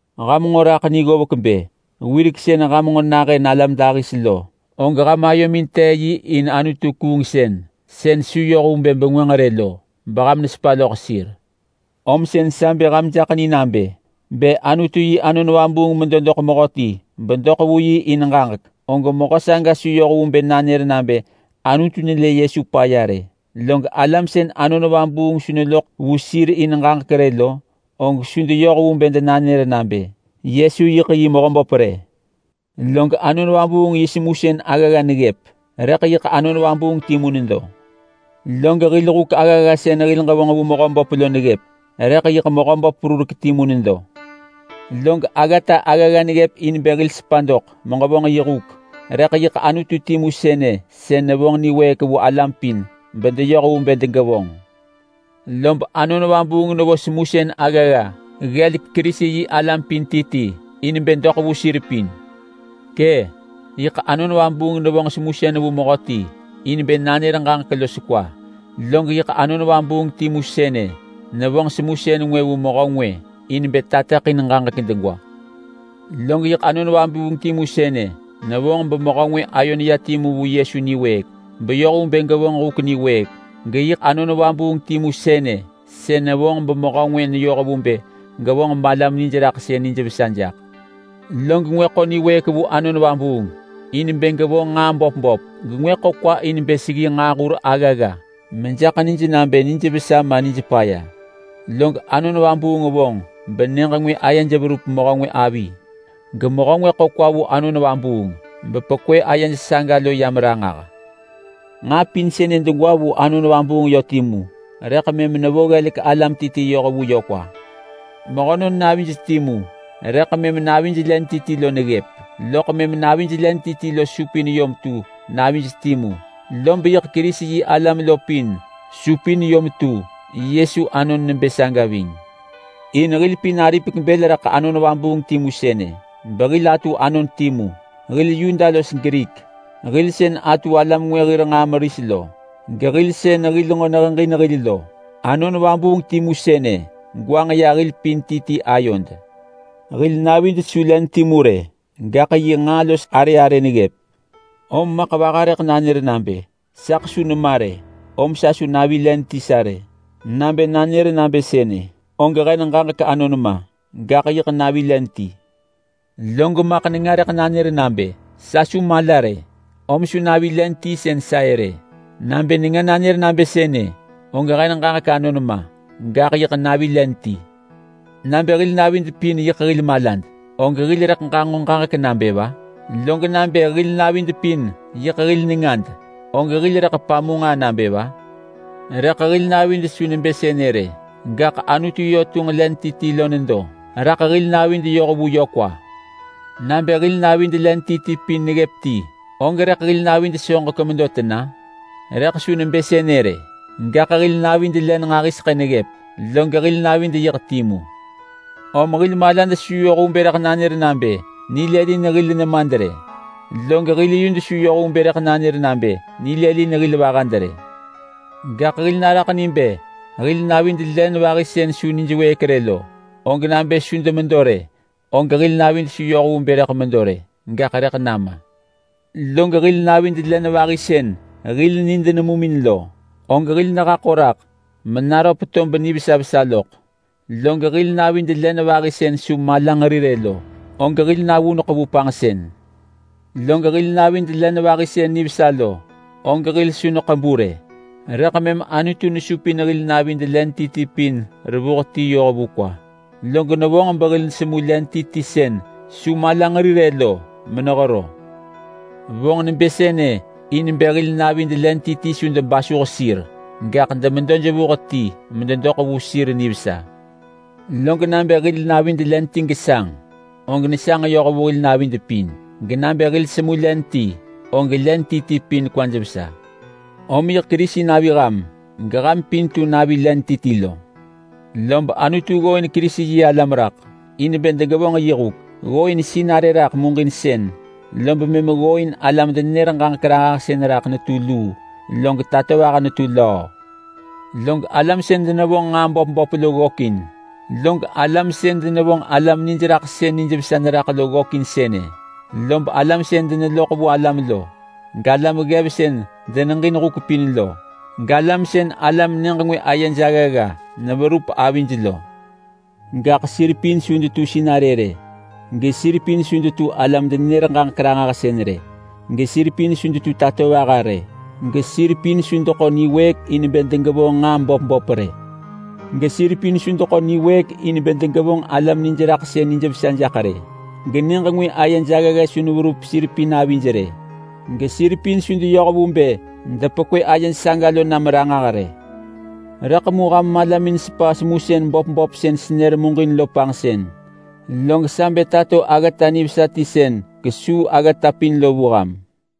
Ham nġo raḳ ni ggovek bë, wirek sën ham nġo nahën alam dahis lo, og ham ayomin tee yi in anutu-kuungsën sën su yoh vu bë bengwënġ rë lo beham nesepa loḳ sir. Om sën sa bë ham jaḳ ni nabë: Bë Anutu yi Anon Vabuung medo doḳ mehöti bedoḳ vu yi in ġaġek, og mehö saga su yoh vu bë nanër nabë Anutu nelë Yesu paya rë. Log alam sën Anon Vabuung su neloḳ vu sir in ġaġek rë lo, og su deyoh vu bë denanër nabë, “Yesu yiḳ yi Mehöböp!” rë. Log Anon Vabuung yi semusën aggagga neggëp rëḳ yiḳ Anon Vabuung timu nedo. Log hil huk aggagga sën hil ġevonġ vu Mehöböp lo neggëp, rëḳ yiḳ Mehöböp perurek timu nedo. Log aggata aggagga neggëp in bë hil sepa doḳ meġevonġ yi huk, rëḳ yiḳ Anutu timu sënë sën nevonġ niwëëk vu alam pin bedeyoh vu bë degevonġ. Lob Anon Vabuung nevo semusën aggagga ggelek Kerisi-yi-alam pin ti ti in bë doḳ vu sir pin. Kë’! Yiḳ Anon Vabuung nevonġ semusën vu mehöti in bë nanër ġaġek los kwa. Log yiḳ Anon Vabuung timu sënë nevonġ semusën ngwë vu mehö ngwë in bë tateḳin ġaġek degwa. Log yiḳ Anon Vabuung timu sënë nevonġ bemehö ngwë ayo neya timu vu Yesu niwëëk beyoh vu bë gevonġ huk niwëëk. Geyiḳ Anon Vabuung timu sënë sën nevonġ bemehö ngwë neyoh vu bë gevonġ balam nijraḳsën nijvesa jaḳ. Log ngwë ḳo niwëëk vu Anon Vabuung in bë gevonġ nġaa böp böp, gengwë ḳo kwa in bë seggi nġaahur aggagga mejaḳ nij nabë nijvesa ma nijpaya. Log Anon Vabuung vonġ benyëġ ngwë ayej verup mehö ngwë avi, gemehö ngwë ḳo kwa vu bepekwë ayej saga lo yam ranġah. Nġaa pin sënë degwa vu Anon Vabuung yö timu rëḳ mëm nevo ggelek alam ti ti yoh vu yö kwa. Mehönon navij timu rëḳ mëm navij len ti ti lo neggëp. Loḳ mëm navij len ti ti lo supin yom tu navij timu. Lob yiḳ Kerisi-yi-alam lo pin supin yom tu Yesu anon nebë saga ving. In hil pin aripek bël raḳ Anon Vabuung timu sënë behil atu anon timu. Hil Yuda los Grik, hil sën atu alam ngwë hir nġaa meris lo, gehil sën hil nġo neheġin hil lo. Anon Vabuung timu sënë gwanġ ya hil pin ti ti ayod. Hil navid su len timu rë, gaḳ yi nġaa los arë arë neggëp. Om maḳ vaha rëḳ nanër nabë, “Saḳ su nema rë om su navi len ti sa rë!” Nabë nanër nabë sënë og hen ġaġek anon ma, gaḳ yiḳ navi len ti. Log maḳ nenga rëḳ nanër nabë, “Sa su mala rë, om su navi len ti sën sa-ë rë!” Nabë nenga nanër nabë sënë, og hen ġaġek anon ma, gaḳ yiḳ navi len ti. Nabë hil navid pin yiḳ hil malad, og hil rëḳ ġanġo ġaġek nabë va? Log nabë hil navid pin yiḳ hil nengad, og hil rëḳ pamu nġaa nabë va? Rëḳ hil navid su nebë sënë rë, gaḳ Anutu yö tunġ len ti ti lo nedo raḳ hil navid yoh vu yö kwa. Nabë hil navid len ti ti pin neggëp ti, og rëḳ hil navid soġek medo tena? Rëḳ su nebë sënë rë! Gaḳ hil navid len nġahiseḳë neggëp log hil navid yiḳ timu. Om hil malad su yoh vu bë rëḳ nanër nabë nilëlin hil nemad rë. Log hil yud su yoh vu bë rëḳ nanër nabë nilëlin hil vahad rë. Gaḳ hil naraḳ ni bë hil navid len vahi sën su nijwëëk rë lo, og nabë su demedo rë, og hil navid su yoh vu bë medo rë, gaḳ rëḳ nama! Log hil navid len vahi sën hil nid nemumin lo, og hil nehaḳo raḳ menaröp tob nivesa vesa loḳ. Log hil navid len vahi sën su malanġeri rë lo, og hil navuneḳ vu panġsën. Log hil navid len vahi sën nivesa lo og hil su neḳebu rë. Rëḳ mëm Anutu nesupin hil navid len ti ti pin revuh ti yoh vu kwa, log nevonġ behil nesemu len ti ti sën su malanġeri rë lo menehero. Vonġ nebë sënë in bë hil navid len ti ti su debasuh sir rë, gaḳ demedo jevuh ti mededoḳ vu sir nivesa. Log nabë hil navid len ti gesanġ, og nesanġ yoh vu hil navid pin. Genabë hil semu len ti, og len ti ti pin kwaj vesa. Om yiḳ Kerisi navi ham geham pin tu navi len ti ti lo. Lob Anutu ggooin Kerisi-yi-alam raḳ in bë degevonġ yi huk. Ggooin sinarë raḳ muġinsën, lob mëm ggooin alam-denenër-ġaġek-ranġahsën raḳ netu luu, log tatovaha netu löö. Log alam sën denevonġ nġaa böp böp lo ggökin, log alam sën denevonġ alam niraḳsën nijvesa neraḳ lo ggökin sënë, lob alam sën deneloḳ vu alam lo, galam ggev sën deneġin huk pin lo, galam sën alam nyëġ ngwë ayej aggagga neverup avij lo. Gaḳ sir pin su detu sinarë rë, gesir pin su detu alam-denenër-ġaġek-ranġahsën rë. Gesir pin su detu tatovaha rë. Gesir pin su deḳo niwëëk in bë degevonġ nġaa böp böp rë. Gesir pin su deḳo niwëëk in bë degevonġ alam nijraḳsën nijvesa jaḳ rë. Genyëġ ngwë ayej aggagga su neverup sir pin avij rë. Gesir pin su deyoh vu bë depekwë ayej saga lo nam ranġah rë. Rëḳ mu ham malamin sepa semusën böp böp sën senër muġin lo panġsën. Log sa bë tato aggata nivesa ti sën kesuu aggata pin lo vu ham.